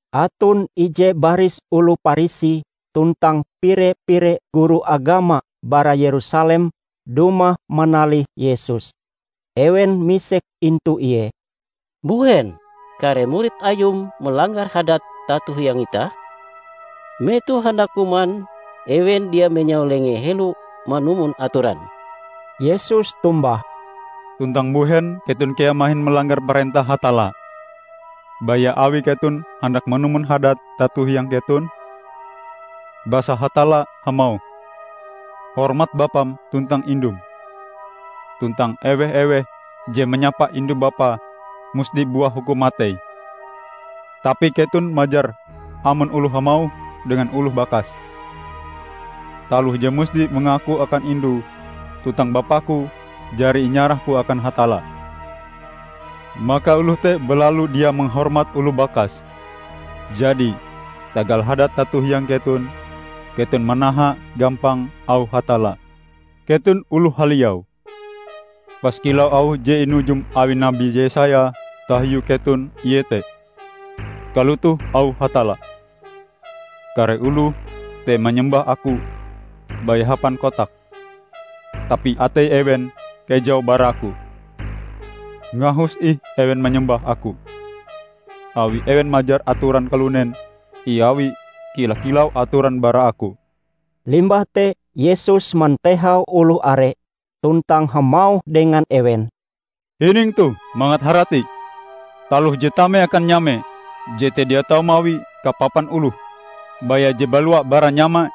Aton ije baris oloh Parisi tuntang pire-pire guru agama bara Yerusalem dumah manalih Yesus. Ewen misek intu Ie, "Mbuhen kare murid Ayum malanggar hadat tato hiang itah? Metoh handak kuman ewen dia menyau lengee helo manumon atoran!" Yesus tombah, "Tuntang mbuhen keton kea mahin malanggar parentah Hatalla, baya awi keton handak manumon hadat tato hiang keton? Basa Hatalla hamauh, 'Hormat bapam tuntang indum,' tuntang 'ewe-eweh je manyapa indu-bapae, musti buah hukum matei.' Tapi keton majar: amon oloh hamauh dengan oloh bakase, 'Taloh je musti inengaku akan indu tuntang bapaku jari inyarahku akan Hatalla,' maka oloh te balalu dia mahormat oloh bakase. Jadi, tagal hadat tato hiang keton, keton manaha gampang auh Hatalla. Keton oloh haliau! Pas kilau auh je inujum awi nabi Yesaya tahiu keton, iete, 'Kalotoh auh Hatalla: Kare oloh te manyembah Aku baya hapan kotake, tapi atei ewen kejau bara Aku. Ngahus ih ewen manyembah Aku, awi ewen majar atoran kalunen iawie kila-kilau atoran bara Aku.' " Limbah te Yesus mantehau oloh are tuntang hamauh dengan ewen, "Hining toh mangat harati! Taloh je tame akan nyame, jete dia tau mawi kapapan oloh; baya je balua bara nyamae,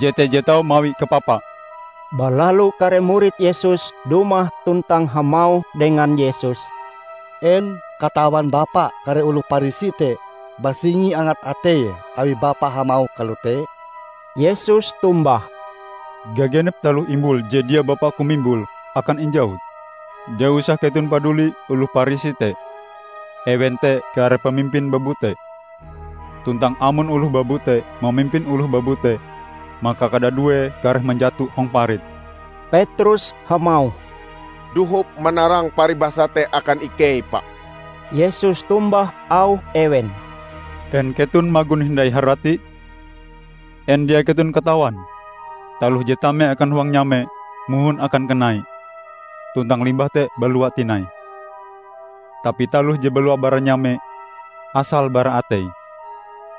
jete je tau mawi kapapae." Balalu kare murid Yesus dumah tuntang hamauh dengan Yesus, "En katawan Bapa kare oloh Parisi te basingi angat ateie awi Bapa hamauh kalote?" Yesus tombah, "Gagenep taloh imbul je dia Bapa-Ku mimbule, akan injawut. Dia usah keton paduli oloh Parisi te. Ewen te kare pamimpin babute; tuntang amon oloh babute mamimpin oloh babute, maka kadaduee kareh manjato hong parit." Petrus hamauh, "Dohop manarang paribasa te akan ikei, Pa!" Yesus tombah auh ewen, "En keton magon hindai haratie? En dia keton katawan, taloh je tame akan huang nyame mohon akan kanai, tuntang limbah te balua tinai? Tapi taloh je balua bara nyame, asale bara atei;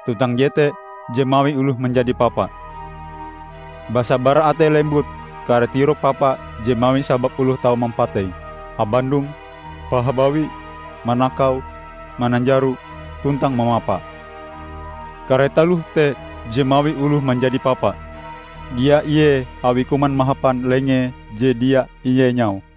tuntang jete je mawi oloh manjadi papa. Basa bara atei lembut kare tirok papa je mawi sabab oloh tau mampatei, habandong, pahabawi, manakau, mananjaro tuntang mamapa. Kare taloh te je mawi oloh manjadi papa, dia ie awie kuman mahapan lenge je dia ienyau."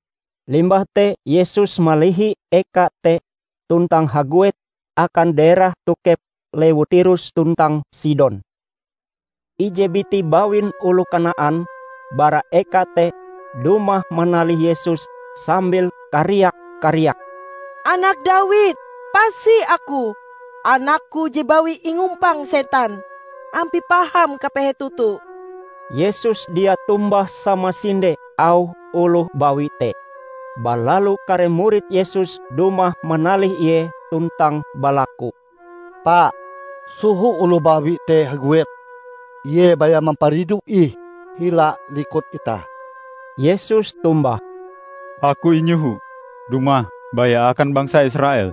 Limbah te Yesus malihi eka te tuntang haguet akan daerah tokep lewu Tirus tuntang Sidon. Ije biti bawin oloh Kanaan bara eka te, dumah manalih Yesus sambil kariak-kariak, "Anak Dawid, pasi aku! Anakku je bawi ingumpang setan. Ampie paham kapehe toto." Yesus dia tombah samasinde auh oloh bawi te. Balalu kare murid Yesus dumah manalih Ie tuntang balaku, "Pa, soho oloh bawi te haguet. Ie baya mamparidu ih hila likut itah!" Yesus tombah, "Aku inyoho dumah baya akan bangsa Israel,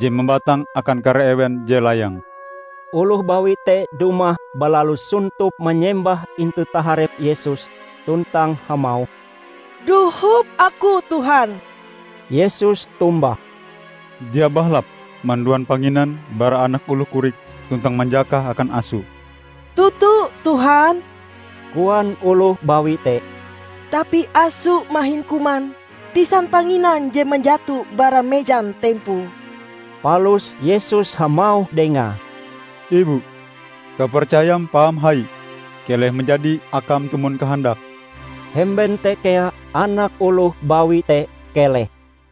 je mambatang akan kare ewen je layang." Oloh bawi te dumah balalu sontop manyembah intu taharep Yesus tuntang hamauh, "Dohop aku, Tuhan." Yesus tombah, "Dia bahalap manduan panginan bara anak oloh korik tuntang manjakahe akan aso." "Toto, Tuhan," koan oloh bawi te, "tapi aso mahin kuman tisan panginan je manjato bara mejan tempoe." Palus Yesus hamauh dengae, "Ibu, kapercayam paham hai! Keleh manjadi akam tumon kahandakm!" Hemben te kea anak oloh bawi te keleh.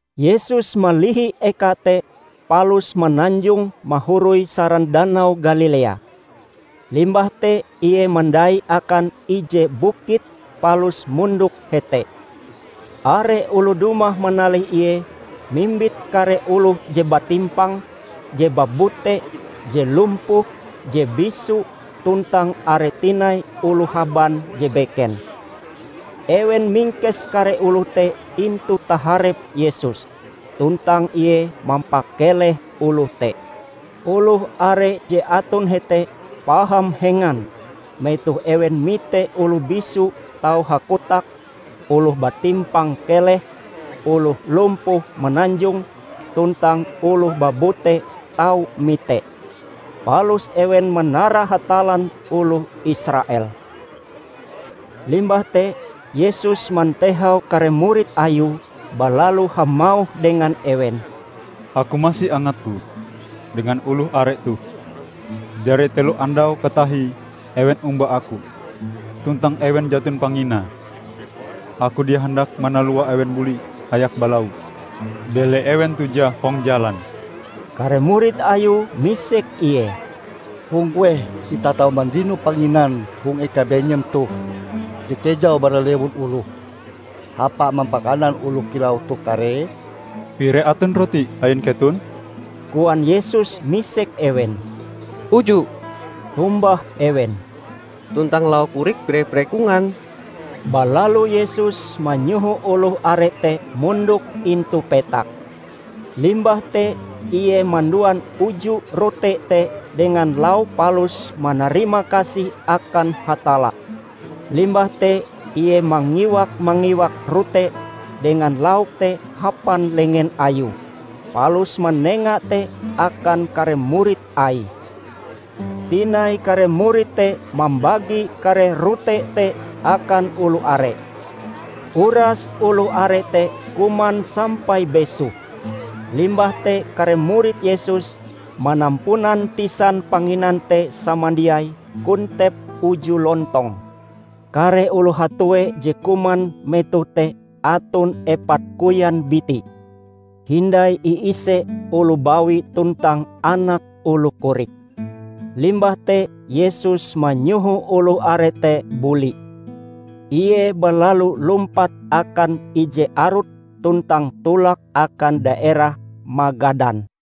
Yesus malihi eka te palus mananjong mahoroi saran Danau Galilea. Limbah te Ie mandai akan ije bukit palus mondok hete. Are oloh dumah manalih Ie mimbit kare oloh je batimpang, je babute, je lumpuh, je bisu, tuntang are tinai oloh haban je beken. Ewen mingkes kare oloh te intu taharep Yesus, tuntang Ie mampakeleh oloh te. Oloh are je aton hete paham hengan metoh ewen mite oloh bisu tau hakotak, oloh batimpang keleh, oloh lumpuh mananjong, tuntang oloh babute tau mite. Palus ewen manara Hatallan oloh Israel. Limbah te Yesus mantehau kare murid Ayue balalu hamauh dengan ewen, "Aku masi angat-Ku dengan oloh are toh. Jari telo andau katahie ewen omba Aku, tuntang ewen jaton panginae. Aku dia handak manalua ewen buli hayak balau, bele ewen tujah hong jalan." Kare murid Ayue misek Ie, "Hong kueh itah tau mandino panginan hong eka benyem toh je kejau bara lewun oloh hapa mampakanan oloh kilau toh karee?" "Pire aton rote ain keton?" koan Yesus misek ewen. "Uju" tombah ewen, "tuntang lauk korik pire-pire kongan." Balalu Yesus manyoho oloh are te mondok intu petak. Limbah te Ie manduan uju rote te dengan lauke palus manarima kasih akan Hatalla. Limbah te Ie mangiwak-mangiwak rote dengan lauk te hapan lengen Ayue palus manenga te akan kare murid Aie. Tinai kare murid te mambagi kare rote te akan oloh are. Uras oloh are te kuman sampai besoh, limbah te kare murid Yesus, manampunan tisan panginan te samandiai kontep uju lontong. Kare oloh hatue je kuman metoh te aton epat koyan biti, hindai iise oloh bawi tuntang anak oloh korik. Limbah te Yesus manyoho oloh are te buli. Ie balalu lumpat akan ije arut tuntang tolak akan daerah Magadan.